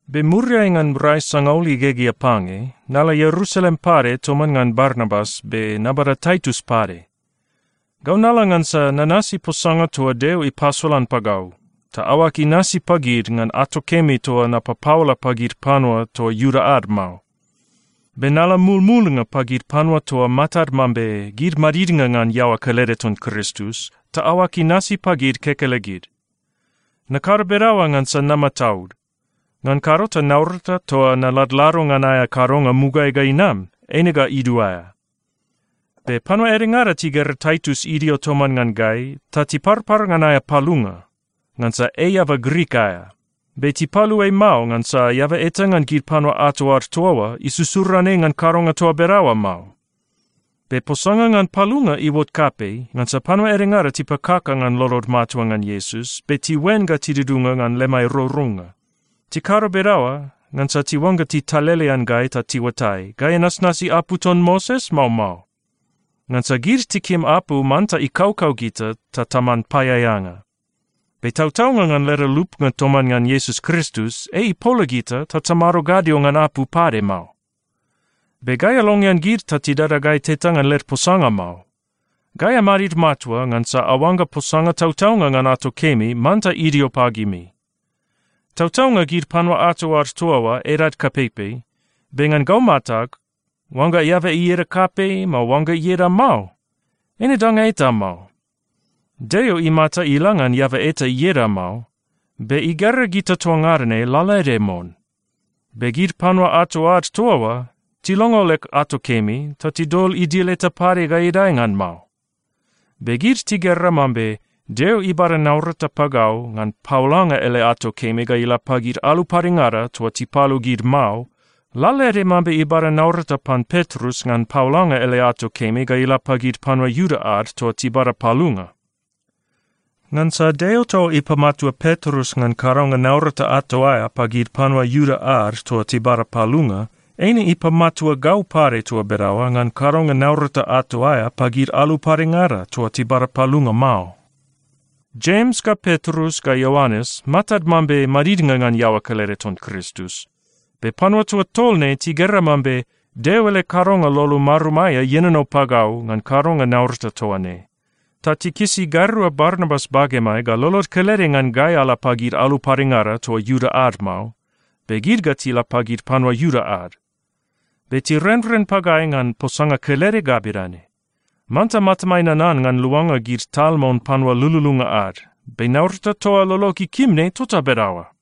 Be muriai ngan rai sangaul igegea pange, nala Ierusalem pade toman ngan Barnabas be nabada Taitus pade. Gau nala ngansa nanasi posanga toa Deo ipasolan pagau, ta aoag inasi pagid ngan ato kemi toa napapaola pagid panua toa Iuda ad mao. Be nala mumulnga pagid panua toa matad mambe gid madidnga ngan iaoa kelede ton Kristus, ta aoag inasi pagid kekelegid. Nakado bedaoa ngansa namataud. Ngan kado ta naurata toa naladlado ngan aea kadonga mugaeai ga inam, eine ga iduaea. Be panua edengada tigera Taitus idio toman ngan gai, ta tiparpar ngan aea palunga, ngansa ei eaba Grik aea. Be tipalu ei mao, ngansa eaba eta ngan gid panua ato ad toa oa isusuran ei ngan kadonga toa bedaoa mao. Be posanga ngan palunga iuot kapei, ngansa panua edengada tipakaka ngan lolod matua ngan Iesus, be tiuen ga tidudunga ngan lemai rourounga. Tikado bedaoa ngansa tiuangga titalelean gai ta tiuatai, gai anasnasi apu ton Moses, mao mao. Ngansa gid tikim apu manta ikaukau gita ta taman paeaeanga. Be tautaunga ngan leda lupnga toman ngan Iesus Kristus, ei ipola gita ta tamado gadio ngan apu pade mao. Be gai alongean gid ta tidada gai teta ngan led posanga mao. Gai amadid matua ngansa aoangga posanga tautaunga ngan ato kemi manta idio pagimi. Tautaunga, gid panua ato ad toa oa edad kapeipei. Be ngan gau matag, oangga eaba ieda kapei, mao oangga ieda mao, eine danga eta mao. Deo imata ila ngan eaba eta ieda mao, be igera gita toa ngada ne lalaede mon. Be gid panua ato ad toa oa tilongo leg ato kemi, ta tidol idil eta pade ga idae ngan mao. Be gid tigera mambe Deo ibada naurata pagau ngan paolanga ele ato kemi ga ila pagid alu padengada toa tipalu gid mao, lalaede mambe ibada naurata pan Petrus ngan paolanga ele ato kemi ga ila pagid panua Iuda ad toa tibada palunga. Ngansa Deo toa ipamatua Petrus ngan kadonga naurata ato aea pagid panua Iuda ad toa tibada palunga, eine ipamatua gau pade toa bedaoa ngan kadonga naurata ato aea pagid alu padengada toa tibada palunga mao. Jems ga Petrus ga Ioanes matad mambe madidnga ngan iaoa kelede ton Kristus. Be panua toa tol ne tigera mambe Deo ele kadonga lolo marum aea ienono pagau ngan kadonga naurata toa ne, ta tikisi gairua Barnabas bagemai ga lolod kelede ngan gai ala pagid alu padengada toa Iuda ad mao, be gid ga tila pagid panua Iuda ad. Be tirenren pagai ngan posanga kelede ga bedane: Manta matamai nanan ngan luanga gid tal mon panua lululunga ad. Be naurata toa lolog ikim ne tota bedaoa.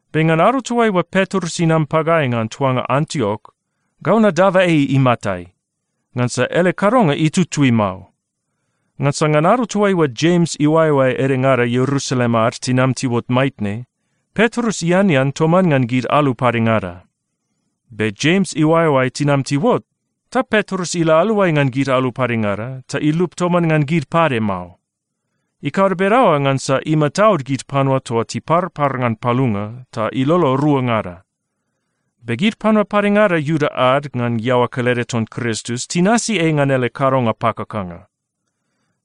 Be ngan ado toaiua Petrus inam pagai ngan tuanga Antiok, gau nadaba ei imatai, ngansa ele kadonga itutui mao. Ngansa ngan ado toaiua Jems iuaeoae edengada Ierusalem ad tinam tiuot maitne, Petrus ianean toman ngan gid alu padengada. Be Jems iuaeoae tinam tiuot, ta Petrus ila aluai ngan gid alu padengada ta ilup toman ngan gid pade mao. Ikado bedaoa ngansa imataud gid panua toa tiparpar ngan palunga, ta ilolo ruangada. Be gid panua padengada Iuda ad ngan iaoa kelede ton Kristus tinasi ei ngan ele kadonga pakakanga.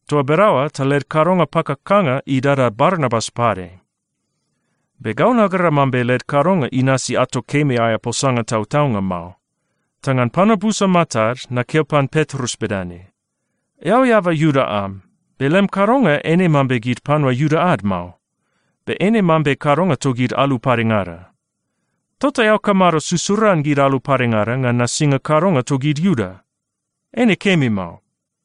Toa bedaoa ta led kadonga pakakanga idada Barnabas pade. Be gau nagera mambe led kadonga inasi ato kemi aea posanga tautaunga mao, ta ngan panua busa matad nakeo pan Petrus bedane, “Eao eaba Iuda am, be lem kadonga eine mambe gid panua Iuda ad mao, be eine mambe kadonga togid alu padengada. Tota eao kamado susuran gid alu padengada ngan nasinga kadonga togid Iuda? Eine kemi mao.”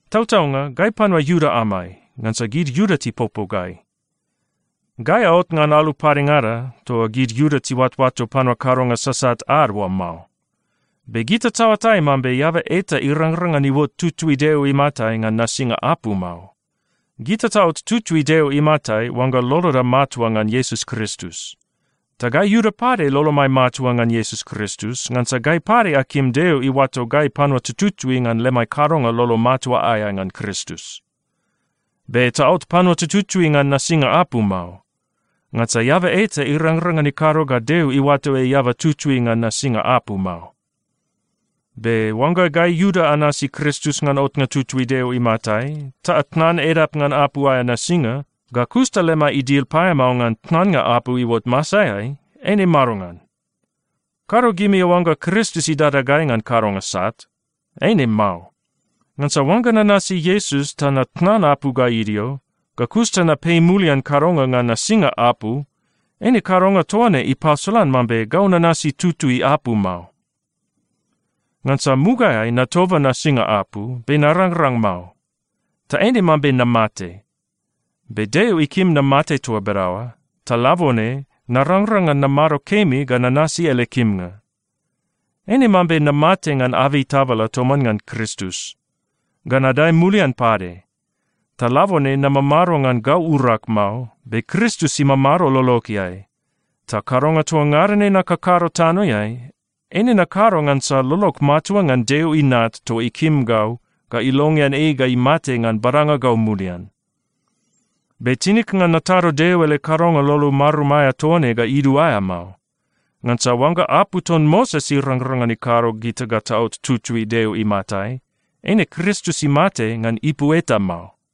Tautaunga, gai panua Iuda amai, ngansa gid Iuda tipopo gai. Gai aot ngan alu padengada toa gid Iuda tiuatoato panua kadonga sasat ad oa mao. Be gita taoatai mambe eaba eta irangrang ngan iuot tutui Deo imatai ngan nasinga apu mao. Gita taot tutui Deo imatai oangga loloda matua ngan Iesus Kristus. Ta gai Iuda pade lolomai matua ngan Iesus Kristus, ngansa gai pade akim Deo iuato gai panua tututui ngan lemai kadonga lolo matua aea ngan Kristus. Be taot panua tututui ngan nasinga apu mao. Ngansa eaba eta irangrang ngan ikado ga Deo iuato ei eaba tutui ngan nasinga apu mao. Be oangga gai Iuda anasi Kristus ngan otnga tutui Deo imatai ta atnan edap ngan apu aea nasinga, ga kus ta lemai idil paeamao ngan tnannga apu iuot masaeai, eine madongan? Kado gimi aoangga Kristus idada gai ngan kadonga sat. Eine mao. Ngansa oangga nanasi Iesus ta natnan apu ga idio, ga kus ta napei mulian kadonga ngan nasinga apu, eine kadonga toa ne ipasolan mambe gau nanasi tutui apu mao. Ngansa mugaeai natoba nasinga apu, be narangrang mao, ta eine mambe namate. Be Deo ikim namate toa bedaoa, ta labone narangrang ngan namado kemi ga nanasi ele kimnga. Eine mambe namate ngan abei tabala toman ngan Kristus, ga nadae mulian pade. Ta labone namamado ngan gau urag mao, be Kristus imamado lologeai. Ta kadonga toa ngada ne nakakado tanoeai, eine nakado ngansa lolog matua ngan Deo Inat toa ikim gau ga ilongean ei ga imate ngan badanga gau mulian. Be tinig ngan natado Deo ele kadonga lolo marum aea toa ne ga iduaea mao. Ngansa oangga apu ton Moses irangrang ngan ikado gita ga taot tutui Deo imatai, eine Kristus imate ngan ipu eta mao.